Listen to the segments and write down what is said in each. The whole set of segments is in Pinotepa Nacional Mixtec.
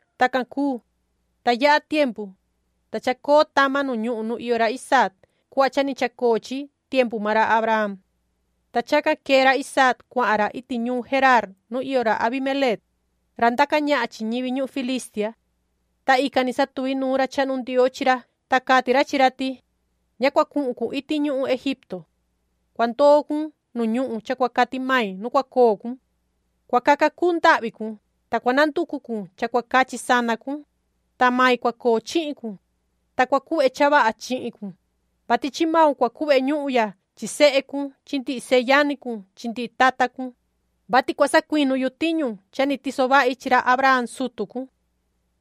Tacan cuu, ta yaha tiempu, ta chacoo tama nu ñuhun nu iyo ra Isaac cuhva cha ni chacoo chi tiempu maan ra Abraham. Ta chacan quee ra Isaac, cuahan ra iti ñuun Geraar nu iyo ra Abimeleec, ra ndaca ñahan chi ñivi ñuhun Filistia. Ta ican ni satuvi nuun ra chahnu Ndioo chi ra, ta cati ra chi ra ti: “Ña cua cuhun cun iti ñuhun Egipto. Cua ndoo cun nu ñuhun cha cua cati mai nu cua coo cun. Cua caca cuu ndahvi cun, ta cua nanducu cun cha cua cachi sana cun, ta mai cua coo chihin cun, ta cua cuhve cha vaha chihin cun, vati chi maun cua cuhve ñuhun ya chi sehe cun chi ndihi seyani cun chi ndihi tata cun, vati cua sacuinu yu tiñu cha ni tiso vahi chi ra Abraham sutu cun.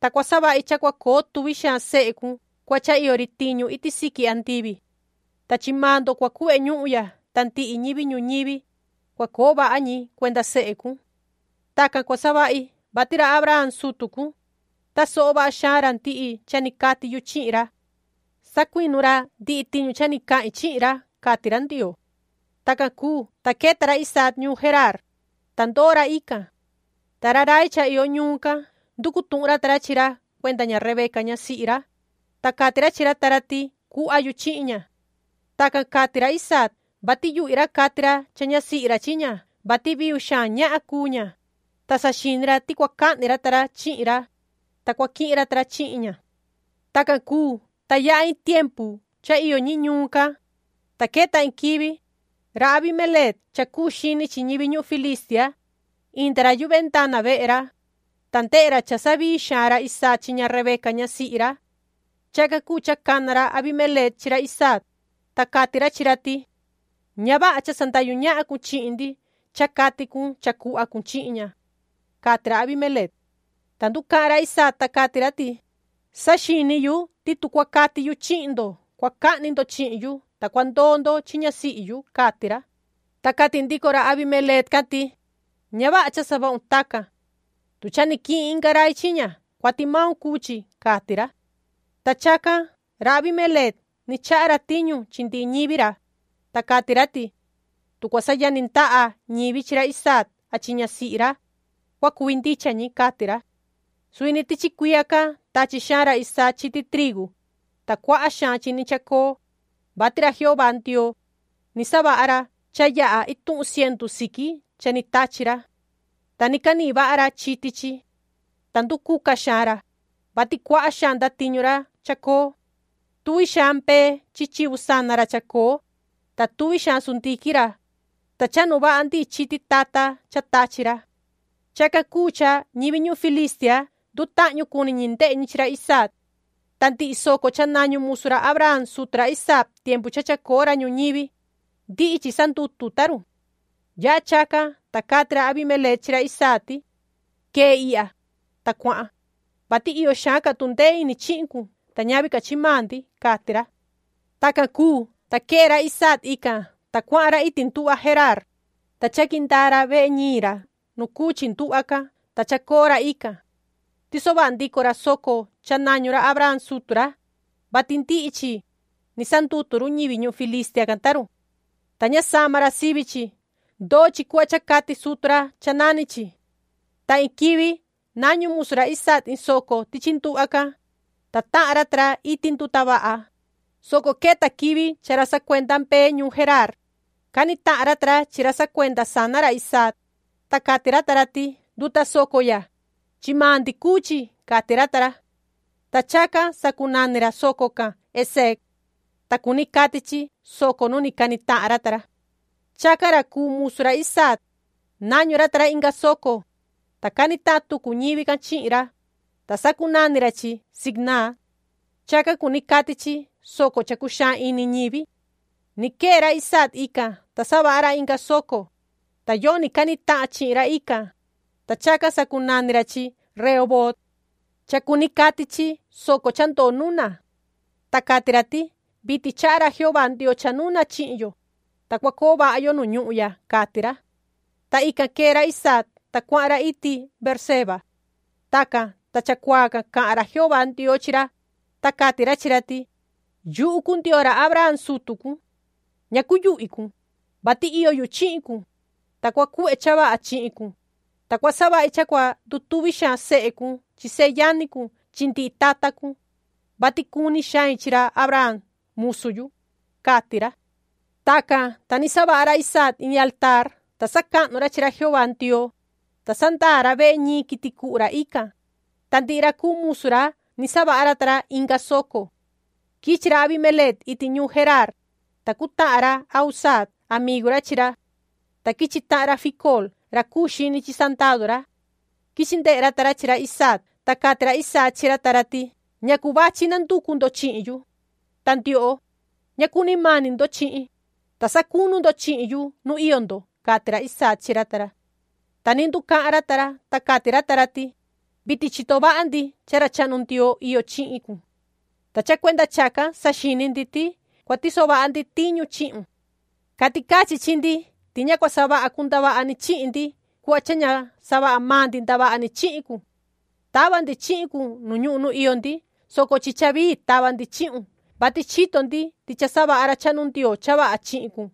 Ta cua savahi cha cua coo tuvi xaan sehe cun cuhva cha iyo ri tiñu iti siqui andivi. Ta chi maan ndo cua cuhve ñuhun ya, ta ndihi ñivi ñuñivi, cua coo vaha ñi cuenda sehe cun. Tacan cua savahi, vati ra Abraham sutu cun, tasoho vaha xaan ra ndihi cha ni cati yu chihin ra. Sacuinu ra ndihi tiñu cha ni cahin chi ra”, cati ra Ndioo. Tacan cuu, ta queta ra Isaac ñuun Geraar, ta ndoo ra ican. Ta ra rai cha iyo ñuun can, nducu tuhun ra ta ra chi ra cuenda ña Rebeca ñasihi ra, ta cati ra chi ra ta ra ti cuhva yu chihin ña. Tacan cati ra Isaac, vati yuhvi ra cati ra cha ñasihi ra chi ña, vati viu xaan ñahan cuu ña, ta saxini ra ti cua cahni ra ta ra chihin ra, ta cua quihin ra ta ra chihin ña. Tacan cuu, ta yaha iin tiempu cha iyo ñi ñuun can, ta queta iin quivi, ra Abimeleec cha cuu xini chi ñivi ñuhun Filistia, inda ra yu vendana vehe ra, ta ndehe ra cha savii xaan ra Isaac chi ña Rebeca ñasihi ra. Chacan cuu cha cana ra Abimeleec chi ra Isaac, ta cati ra chi ra ti: ―¡Ña vaha cha sandahyu ñahan cun chihin ndi cha cati cun cha cuhva cun chihin ña! ―cati ra Abimeleec. Ta nducahan ra Isaac, ta cati ra ti: ―Saxini yu ti tu cua cati yu chihin ndo, cua cahni ndo chihin yu, ta cua ndoo ndo chi ñasihi yu ―cati ra. Ta cati ndico ra Abimeleec can ti: ―Ña vaha cha savahun tacan. Tu cha ni quihin inga rai chi ña, cuati maun cuu chi ―cati ra. Ta chacan ra Abimeleec ni chaha ra tiñu chi ndihi ñivi ra, ta cati ra ti: ―Tu cua sayani ndaha ñivi chi ra Isaac a chi ñasihi ra, cua cuvi ndicha ñi ―cati ra. Suvi ni tichi cuiya can tachi xaan ra Isaac chiti trigu, ta cuaha xaan chi chacoo, vati ra Jehová Ndioo, ni savaha ra cha yaha ituhun cientu siqui cha ni tachi ra. Ta ni canihin vaha ra chiti chi. Ta nducuca xaan ra, vati cuaha xaan ndatiñu ra chacoo. Tuvi xaan mbee chi chivu sana ra chacoo, ta tuvi xaan sundiquin ra, ta chahnu vaha ndihi chiti tata cha tachi ra. Chacan cuu cha ñivi ñuhun Filistia, ndutahñu cuni ñi ndehe ñi chi ra Isaac. Ta ndihi soco cha nañu musu ra Abraham sutu ra Isaac tiempu cha chacoo ra ñuñivi, ndihi chi sandutu ta run. Yaha chacan, ta cati ra Abimeleec chi ra Isaac ti: ―Quee ihya, ta cuahan, vati iyo xaan ca tundee ini chihin cun ta ñavi ca chi maan ndi ―cati ra. Tacan cuu, ta quee ra Isaac ican, ta cuahan ra iti nduhva Geraar, ta chaqui ndaa ra vehe ñiin ra nu cuu chi nduhva can, ta chacoo ra ican. Tiso vaha ndico ra soco cha nañu ra Abraham sutu ra, vati ndihi chi, ni sandutu run ñivi ñuhun Filistia can ta run. Ta ña sama ra sivi chi. Ndoo chi cuhva cha cati sutu ra cha nani chi. Ta iin quivi nañu musu ra Isaac iin soco tichi nduhva can, ta tahan ra ta ra iti nduta vaha, soco queta quivi cha ra sacuenda mbee ñuun Geraar, cani tahan ra ta ra chi ra sacuenda sana ra Isaac, ta cati ra ta ra ti: “Nduta soco ya, chi maan ndi cuu chi”, cati ra ta ra. Ta chacan sacunani ra soco can Eseek. Ta cuni cati chi”Soco nu ni cani tahan ra ta ra”. Chacan ra cuu musu ra Isaac, nañu ra ta ra inga soco, ta cani tahan tucu ñivi can chihin ra, ta sacunani ra chi Sitnaa. Chacan cuni cati chi”Soco cha cuxaan ini ñivi”. Ni quee ra Isaac ican, ta savaha ra inga soco, ta yoni cani tahan chihin ra ican, ta chacan sacunani ra chi Rehoboot. Cha cuni cati chi”Soco cha ndoo nuna”. Ta cati ra ti: “Vitin chaha ra Jehová Ndioo cha nuna chihin yo, ta cua coo vaha yo nu ñuhun ya”, cati ra. Ta ican quee ra Isaac, ta cuahan ra iti Beerseba. Tacan, ta chacuaa can cahan ra Jehová Ndioo chi ra, ta cati ra chi ra ti: “Yuhu cuu Ndioo ra Abraham sutu cun. Ña cuyuhvi cun, vati iyo yu chihin cun, ta cua cuhve cha vaha chihin cun, ta cua savahi cha cua ndutuvi xaan sehe cun chi seyani cun chi ndihi tata cun, vati cuni xain chi ra Abraham musu yu”, cati ra. Tacan, ta ni savaha ra Isaac in altaar, ta sacahnu ra chi ra Jehová Ndioo, ta sandaa ra vehe ñiin quiti cuhu ra ican, ta ndihi ra cuu musu ra ni savaha ra ta ra inga soco. Quichi ra Abimeleec iti ñuun Geraar, ta cutahan ra Ahuzaat amigu ra chi ra. Ta quichi tahan ra Ficool ra cuu xini chi sandadu ra. Quichi ndehe ra ta ra chi ra Isaac. Ta cati ra Isaac chi ra ta ra ti: ―¿Ñacu vachi nanducu ndo chihin yu? Ta ndioho, ña cuni mani ndo chihin, ta sacunu ndo chihin yu nu iyo ndo ―cati ra Isaac chi ra ta ra. Ta ni nducahan ra ta ra, ta cati ra ta ra ti: ―Vitin chito vaha ndi cha ra chahnu Ndioo iyo chihin cun. Ta cha cuenda chacan saxini ndi ti cua tiso vaha ndi tiñu chihin cun. Cati cachi chi ndi ti ña cua savaha cun ndavaha ni chihin ndi cuhva cha ña savaha maan ndi ndavaha ni chihin cun. Tava ndi chihin cun ñuhun nu iyo ndi, soco chi cha vii tava ndi chihun, vati chito ndi ti cha savaha ra chahnu Ndioo cha vaha chihin cun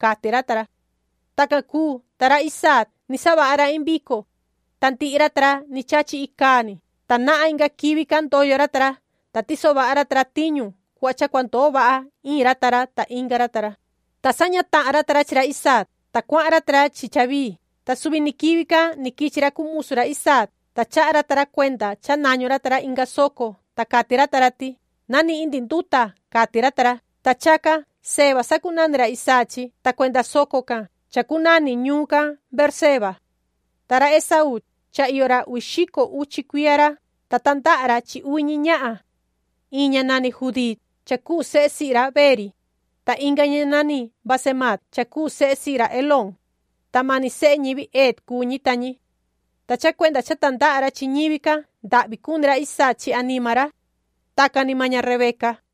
―cati ra ta ra. Tacan cuu, ta ra Isaac, ni savaha ra iin vico, ta ndihi ra ta ra ni chachi icaa ni. Ta nahan inga quivi can ndoyo ra ta ra, ta tiso vaha ra ta ra tiñu cuhva cha cua ndoo vaha iin ra ta inga ra ta ra, ta saña tahan ra ta ra chi ra Isaac, ta cuahan ra ta ra chi cha vii. Ta suvi ni quivi can ni quichi ra cuu musu ra Isaac, ta chaha ra ta ra cuenda cha nañu ra ta ra inga soco, ta cati ra ta ra ti: ―Na nihin ndi nduta ―cati ra ta ra. Ta chacan Seba sacunani ra Isaac chi, ta cuenda soco can chacunani ñuun can Beerseba. Ta ra Esaú, cha iyo ra uvi xico cuiya ra, ta tandaha ra chi uvi ñi ñahan. Iin ña nani Judiit cha cuu sehe sihi ra Beeri, ta inga ña nani Basemaat cha cuu sehe sihi ra Elón, ta mani sehe ñivi Het cuu ñi ta ñi. Ta cha cuenda cha tandaha ra chi ñivi can, ndahvi cuni ra Isaac chi anima ra. Tacan ni maan ña Rebeca.